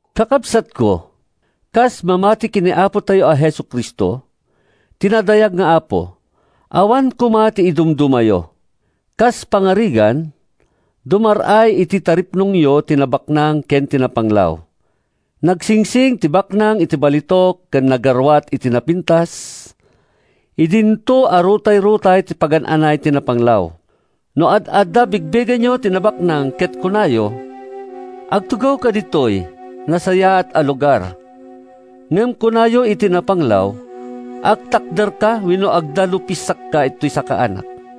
Kakabsatko, kas mamati ken ni Apotayo a Jesu-Cristo, ti nadayag nga Apo, awan koma ti idumdumayo. Kas pangarigan, dumar-ay iti taripnongyo ti nabaknang ken ti napanglaw. Nagsingsing ti baknang iti balitok ken nagaruat iti napintas idinto a rutayrutay ti pagan-anay ti napanglaw. No ad-adda a bigbigenyo ti nabaknang ket kunayo, “Agtugawka ditoy nasayaat a lugar,” ngem kunayo iti napanglaw, “Agtakderka wenno agdalupisakka iti sakaanak,”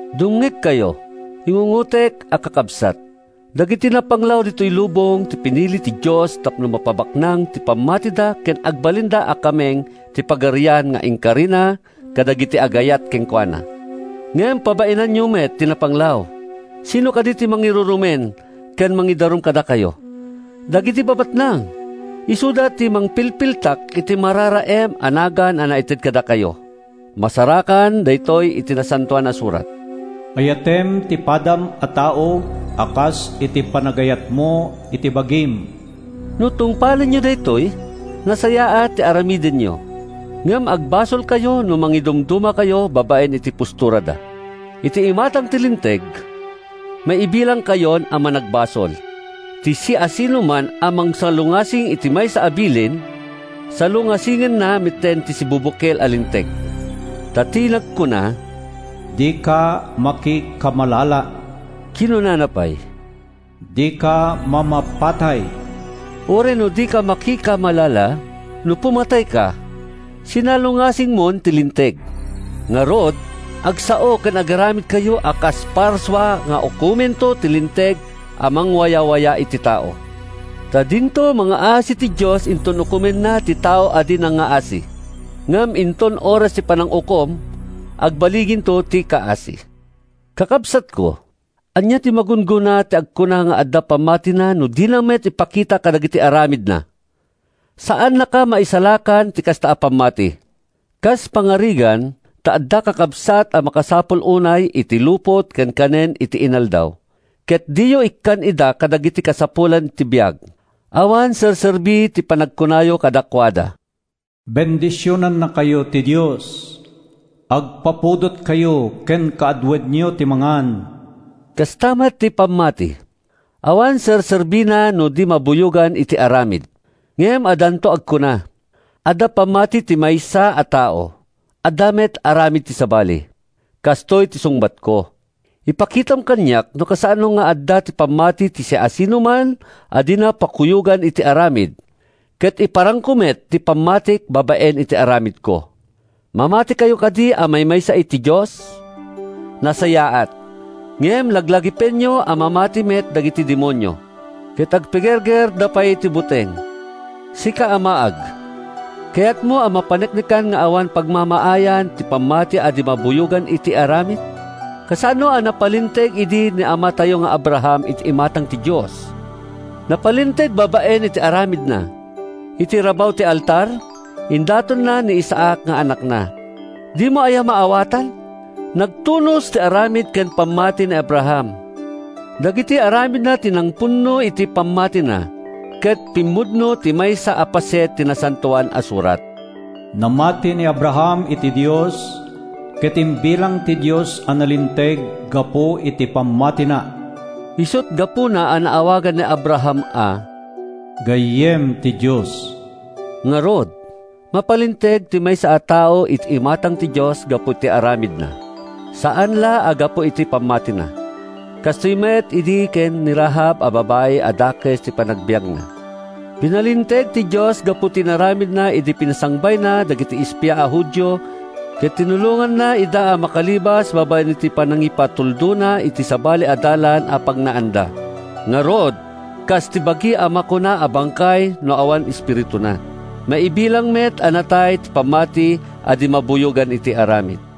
Dumngegkayo, ingungotek a kakabsat! Dagiti napanglaw ditoy lubong ti pinili ti Dios tapno mapabaknang ti pammatida ken agbalinda a kameng ti Pagarian nga inkarina kadagiti agayat kenkuana. Ngem pabainanyo met ti napanglaw! Sinno kadi ti mangirurumen ken mangidarum kadakayo? Dagiti babaknang! Isuda ti mangpilpiltak iti mararaem a nagan a naited kadakayo. Masarakan daytoy iti Nasantoan a Surat: “Ayatem ti padam a tao a kas iti panangayatmo iti bagim.” No tungpalenyo daytoy, nasayaat ti aramidenyo. Ngem agbasolkayo no mangidumdumakayo babaen iti posturada. Iti imatang ti Linteg, maibilangkayon a managbasol. Ti siasinoman a mangsalungasing iti maysa a bilin, salungasingenna metten ti sibubukel a linteg. Ta ti nagkuna, “Dika makikamalala,” kinunana pay, “Dika mamapatay.” Uray no dika makikamalala, no pumatayka, sinalungasingmon ti linteg. Ngarud, agsao ken agaramidkayo a kas parsua nga ukomento ti linteg a mangwayawaya iti tao. Ta dinto mangngaasi ti Dios inton ukomenna ti tao a di nangngaasi; ngem inton oras ti panangukom, agballiginto ti kaasi. Kakabsatko, ania ti magunggona ti agkuna nga adda pammatina no dina met ipakita kadagiti aramidna? Saannaka a maisalakan ti kasta a pammati. Kas pangarigan ta adda kakabsat a makasapul unay iti lupot ken kanen iti inaldaw, ket diyo ikkan ida kadagiti kasapulan ti biag, awan serserbi ti panagkunayo kadakuada, “Bendisionannakayo ti Dios! Agpapudotkayo ken kaaduenyo ti mangan.” Kasta met ti pammati: awan serserbina no di mabuyogan iti aramid. Ngem addanto agkuna, “Adda pammati ti maysa a tao; adda met aramid ti sabali.” Kastoy ti sungbatko: “Ipakitam kaniak no kasano nga adda ti pammati ti siasinoman a dina pakuyogan iti aramid, ket iparangko met ti pammatik babaen iti aramidko.” Mamatikayo kadi a maymaysa ti Dios? Nasayaat! Ngem laglagipenyo a mamati met dagiti demonio—ket agpigergerda pay iti buteng. Sika a maag, kayatmo a mapaneknekan nga awan pagmamaayan ti pammati a di mabuyogan iti aramid? Kasano a napalinteg idi ni amatayo nga Abraham iti imatang ti Dios? Napalinteg babaen iti aramidna! Iti rabaw ti altar, indatonna ni Isaac nga anakna. Dimo aya maawatan? Nagtunos ti aramid ken ti pammati ni Abraham. Dagiti aramidna ti nangpunno iti pammatina. Ket pimmudno ti maysa a paset ti Nasantoan a Surat: “Namati ni Abraham iti Dios, ket imbilang ti Dios a nalinteg gapu iti pammatina.” Isut’ gapuna a naawagan ni Abraham a “gayyem ti Dios.” Ngarud, mapalinteg ti maysa a tao iti imatang ti Dios gapu iti aramidna, saan la a gapu iti pammatina. Kastoy met idi ken ni Rahab a babai a dakes ti panagbiagna. Pinalinteg ti Dios gapu iti inaramidna idi pinasangbayna dagiti espia a Judio ket tinulonganna ida a makalibas babaen iti panangipatuldona iti sabali a dalan a pagnaanda. Ngarud, kas ti bagi a makuna a bangkay no awan espirituna, maibilang met a natay ti pammati a di mabuyogan iti aramid.